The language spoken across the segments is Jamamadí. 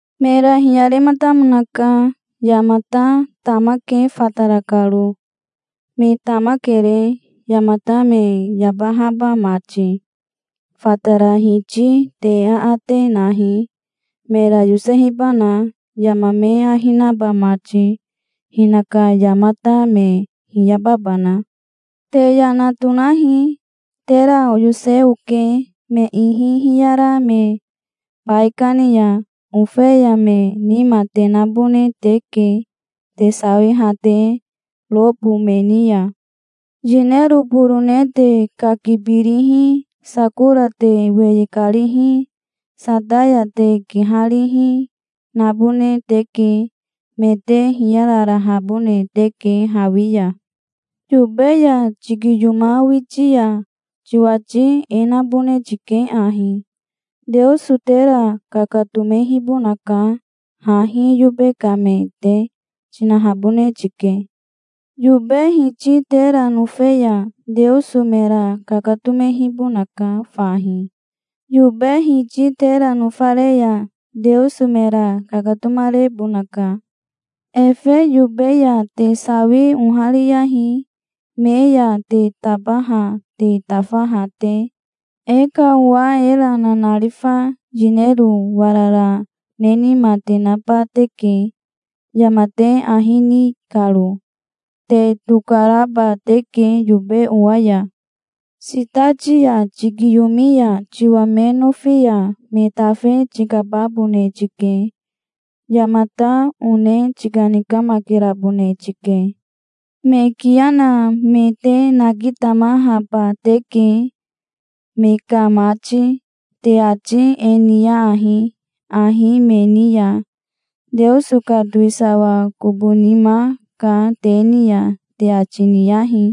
Mera hiyarematamonaka. "Yamata tamake fatara karo. Me tamakere, yamata me yabahaba mati. Fatara Hiti te aate nahi, mera yosehibana, yama me ahi naba mati, hinaka yamata me hiyababana. Te yana tonahi. Tera oyose oke me ihi hiyara me baikani ya. Ofeya me nima te nabone teke, te sawiha te robo me ni ya. Yinero borone te kakibirihi, sakora te weye karihi, sataya te kiharihi, nabone teke. Me te hiyararahabone teke hawi ya. Yobe ya tikiyomawiti ya tiwati e nabone tike ahi: 'Teoso tera kakatomehibonaka hahi yobe ka me te', tinahabone tike. Yobe hiti tera nofe ya Teoso mera kakatomehibonaka fahi. Yobe hiti tera nofare ya Teoso mera kakatomarebonaka. Efe yobe ya te sawi ohariyahi, me ya te tabaha te tafaha te. E ka owa era nanarifa yinero warara ne nima te naba teke, yama te ahi ni karo. Te tokaraba teke yobe owa ya. Sitati ya tikiyomi ya tiwa me nofi ya me tafe tikababone tike. Yamata one tikanikamakerabone tike. Me kiya na me te nakitamahaba teke, me ka mati. Te ati e niyahi ahi me ni ya: 'Teoso ka towisawa kobo nima ka te ni ya', te ati niyahi.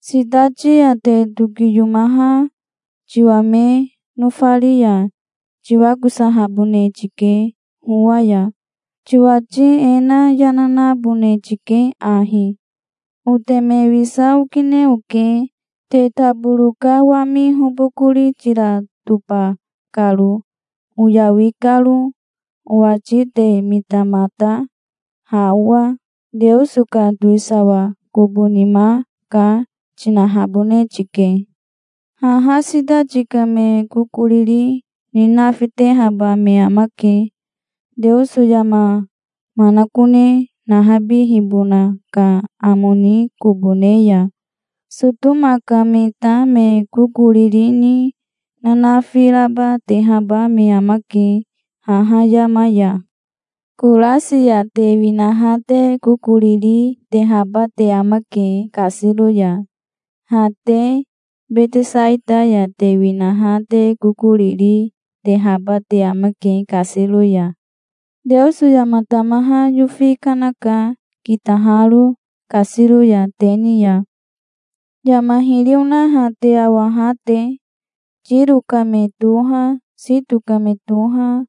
Sitati ya te tokiyomaha tiwa me nofari ya tiwakosahabone tike howa ya. Tiwati e na yana nabone tike ahi: 'Oteme wisa okine oke, te taboro ka wami hobokori tira toba karo, oyawi karo. Owati te mitamata, ha owa. Teoso ka towisawa kobo nima ka', tinahabone tike. Haha sitati ka me kokoriri ni nafitehaba me amake, Teoso yama manakone nahabihibona ka amo ni kobo ne ya. Sotoma ka me ta me kokoriri ni nanafi raba tehaba me amake haha yama ya". "Korasi ya te winaha te kokoriri tehaba te amake kasiro ya. Ha te Betesaita ya te winaha te kokoriri tehaba te amake kasiro ya. Teoso yama tamaha yofi kanaka kitaharo kasiro ya te ni ya, yama hiri onaha te awaha te. Tiro ka me toha, Sito ka me toha,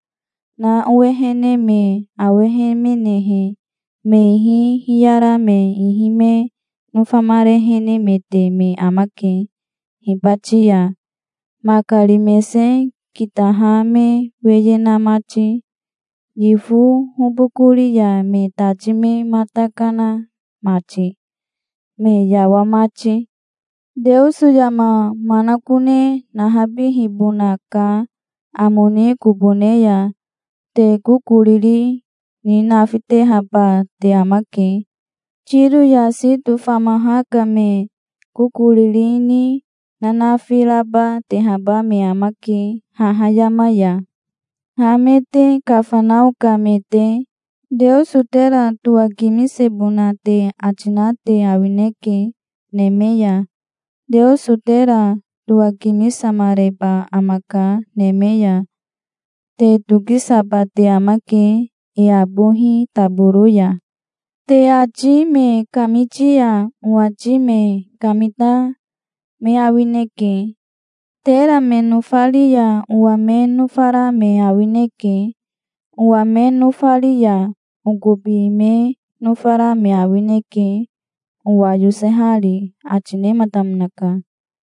na owehene me awehemenehe, me ihi hiyara me ihi me nofamarehenemete me amake hibati ya, makari mese kitaha me weye na mati, yifo hobokori ya me tati me mata kana mati, me yawa mati. Teoso yama manakone nahabihibona ka amo ni kobo ne ya te kokoriri ni nafitehaba te amake. Tiro ya Sito famaha ka me kokoriri ni nanafi raba tehaba me amake haha yama ya. Ha me te Kafanao ka me te, Teoso tera towakimisebona te ati na te awineke, neme ya. Teoso tera towakimisamareba amaka neme ya. Te tokisaba te amake e abohi taboro ya". "Te ati me kamiti ya owati me kamita me awineke. Tera me nofari ya owa me nofara me awineke. Owa me nofari ya okobi me nofara me awineke, owa yosehari", ati nematamonaka.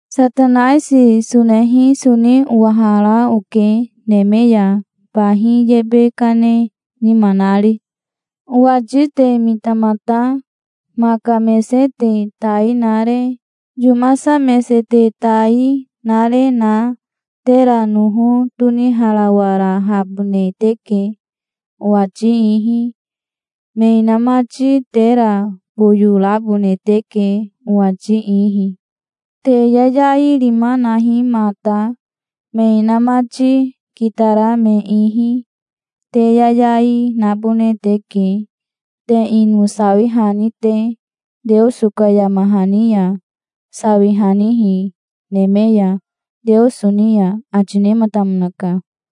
"Satanaisi sonehi soni owahara oke neme ya, bahi yebe kane nima nari. Owati te mitamata. Maka mese te tai nare, yomasa mese te tai nare na tera noho toniharawarahabone teke, owati ihi. Me inamati tera boyo rabone teke, owati ihi. Te yayai rima nahi mata, me inamati kitara me ihi. Te yayai nabone teke, te ino sawihani te, Teoso ka yama hani ya, sawihanihi neme ya, Teoso ni ya", ati nematamonaka.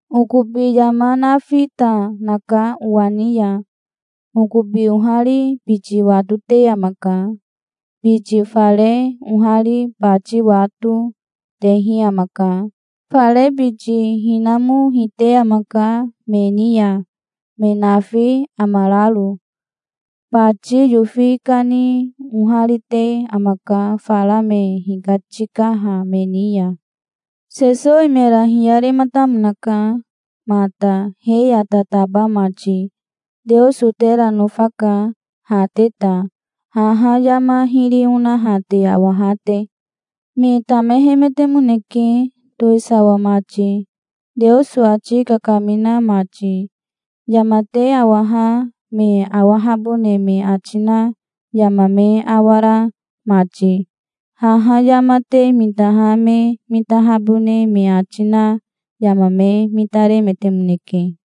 "Okobi yama nafi ta naka owa ni ya. Okobi ohari biti watote amaka. Biti fare ohari bati wato, tehi amaka. Fare biti hinamo hite amaka me ni ya, me nafi amararo. Bati yofi kani oharite amaka fara me hikatikaha me ni ya". Sesowi mera hiyarematamonaka mata, he ya tataba mati. "Teoso tera nofaka, ha te ta, haha yama hiri onaha te awaha te. Me tamehemetemoneke, towisawa mati, Teoso ati kakamina mati, yama te awaha me awahabone me ati na yama me awara mati. Haha yama te mitaha me mitahabone me ati na yama me mitaremetemoneke".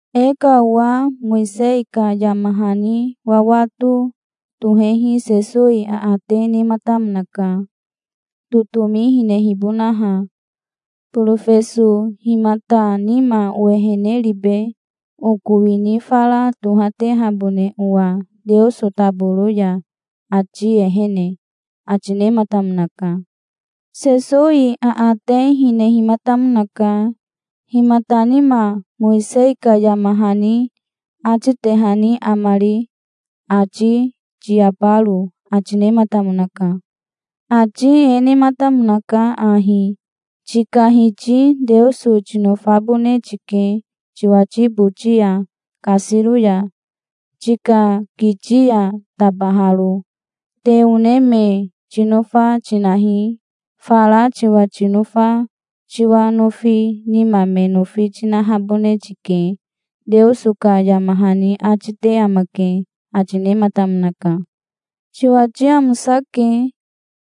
E ka owa Mowisei ka yama hani wawato tohehi Sesowi aate nematamonaka, totomi hinehibonaha. "Borofeso himata nima owehene ribe, oko wini fara tohatehabone owa Teoso taboro ya, ati ehene?" ati nematamonaka. Sesowi aate hinehimatamonaka: "Himata nima Mowisei ka yama hani atitehani amari, ati tiyabaro?" ati nematamonaka. "Ati e nematamonaka ahi: 'Tika Hiti Teoso tinofabone tike tiwati boti ya kasiro ya, tika kiti ya tabaharo. Te one me tinofa tinahi. Fara tiwa tinofa tiwa nofi nima me nofi tinahabone tike', Teoso ka yama hani ati te amake", ati nematamonaka. "Tiwati amosake.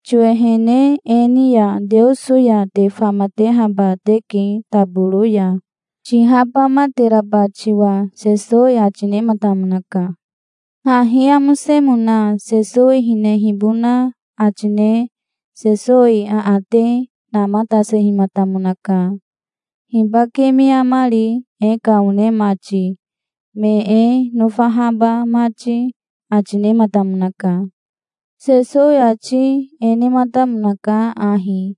Tiwehene e ni ya Teoso ya te famatehaba teke taboro ya, tihabamateraba tiwa", Sesowi ati nematamonaka. Hahi amosemona Sesowi hinehibona ati ne Sesowi aate namatasehimatamonaka. "Hibake me amari, e ka one mati, me e nofahaba mati?" ati nematamonaka. Sesowi ati e nematamonaka ahi: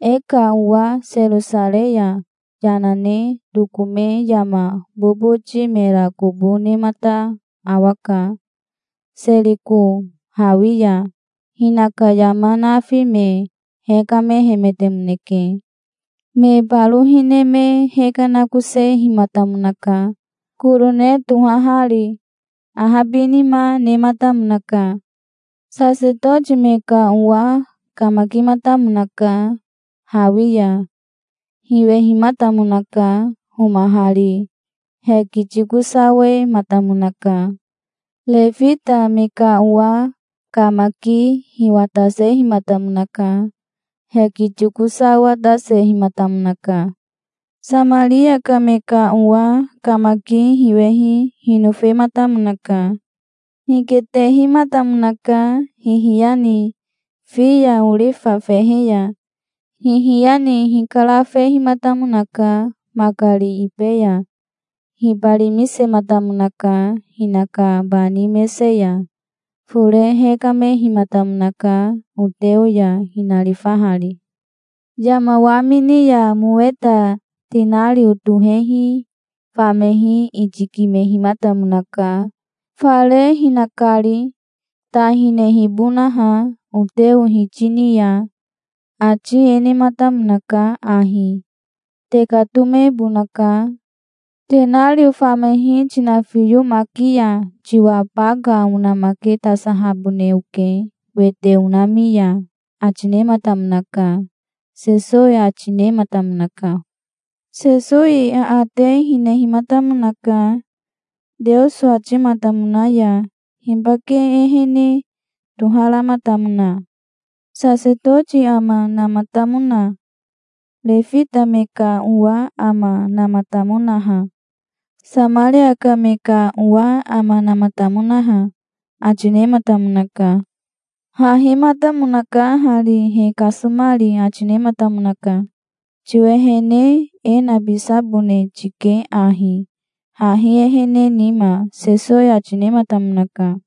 "E ka owa Serosarei ya yana ne tokome yama boboti mera kobo nemata awaka, Seriko hawi ya. Hinaka yama nafi me hekamehemetemoneke. Me baro hine me hekanakosehimatamonaka, korone tohahari. Ahabinima nematamonaka. Sasetoti me ka owa kamakimatamonaka hawi ya. Hiwehimatamonaka homahari. Hekitikosawematamonaka. Refita me ka owa kamaki hiwatasehimatamonaka. Hekitikosawatasehimatamonaka. Samaria ka me ka owa kamaki hiwehi hinofematamonaka. Hiketehimatamonaka hihiya ni, fi ya, orifa fehe ya. Hihiya ni hikarafehimatamonaka makari ibe ya. Hibarimisematamonaka hinaka bani mese ya. Fore hekamehimatamonaka oteo ya, hinarifahari. Yama wamini ya moweta tenario tohehi famehi itikimehimatamonaka, fare hinakari, ta hinehibonaha oteo hiti ni ya. Ati e nematamonaka ahi: 'Tekatomebonaka. Tenario famehi tinafiyomaki ya tiwa baka onamaketasahabone oke wete onami ya', ati nematamonaka", Sesowi ati nematamonaka. Sesowi aate hinehimatamonaka. "Teoso atimatamona ya hibake ehene toharamatamona? Sasetoti ama namatamona? Refita me ka owa ama namatamonaha? Samaria ka me ka owa ama namatamonaha?" ati nematamonaka. "Hahimatamonaka hari, he kasomari", ati nematamonaka. "Tiwehene e nabisabone tike ahi, hahi ehene nima", Sesowi ati nematamonaka.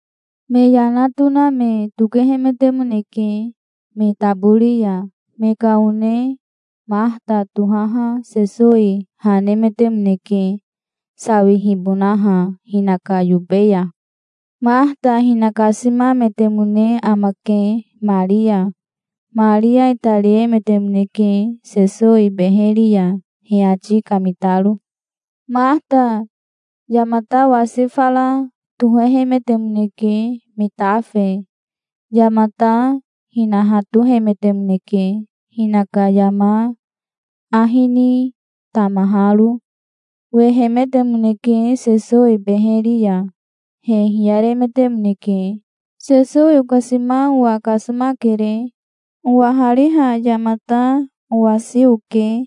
Me yana tona me tokehemetemoneke me tabori ya. Me ka one Mahata tohaha Sesowi ha nemetemoneke sawihibonaha hinaka yobe ya. Mahata hinakasimametemone amake Maria. Maria itariemetemoneke Sesowi beheri ya, he ati kamitaro. Mahata yamata wasi fara tohehemetemoneke me tafe. Yamata hinahatohemetemoneke, hinaka yama ahi ni tamaharo. Wehemetemoneke Sesowi beheri ya. He hiyaremetemoneke. "Sesowi okasima owa kasomakere. Owahariha yamata owasi oke.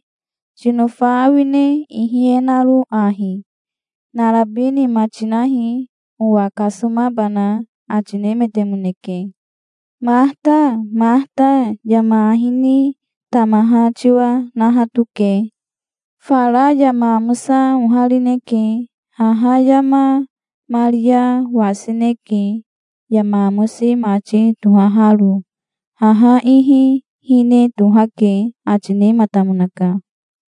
Tinofa awine ihi e naro ahi? Narabi nima tinahi, owa kasomabana", ati nemetemoneke. "Mahata, Mahata, yama ahi ni tamaha tiwa nahatoke. Fara yama amosa oharineke. Haha yama Maria wasineke, yama amosi mati tohaharo. Haha ihi hine tohake", ati nematamonaka.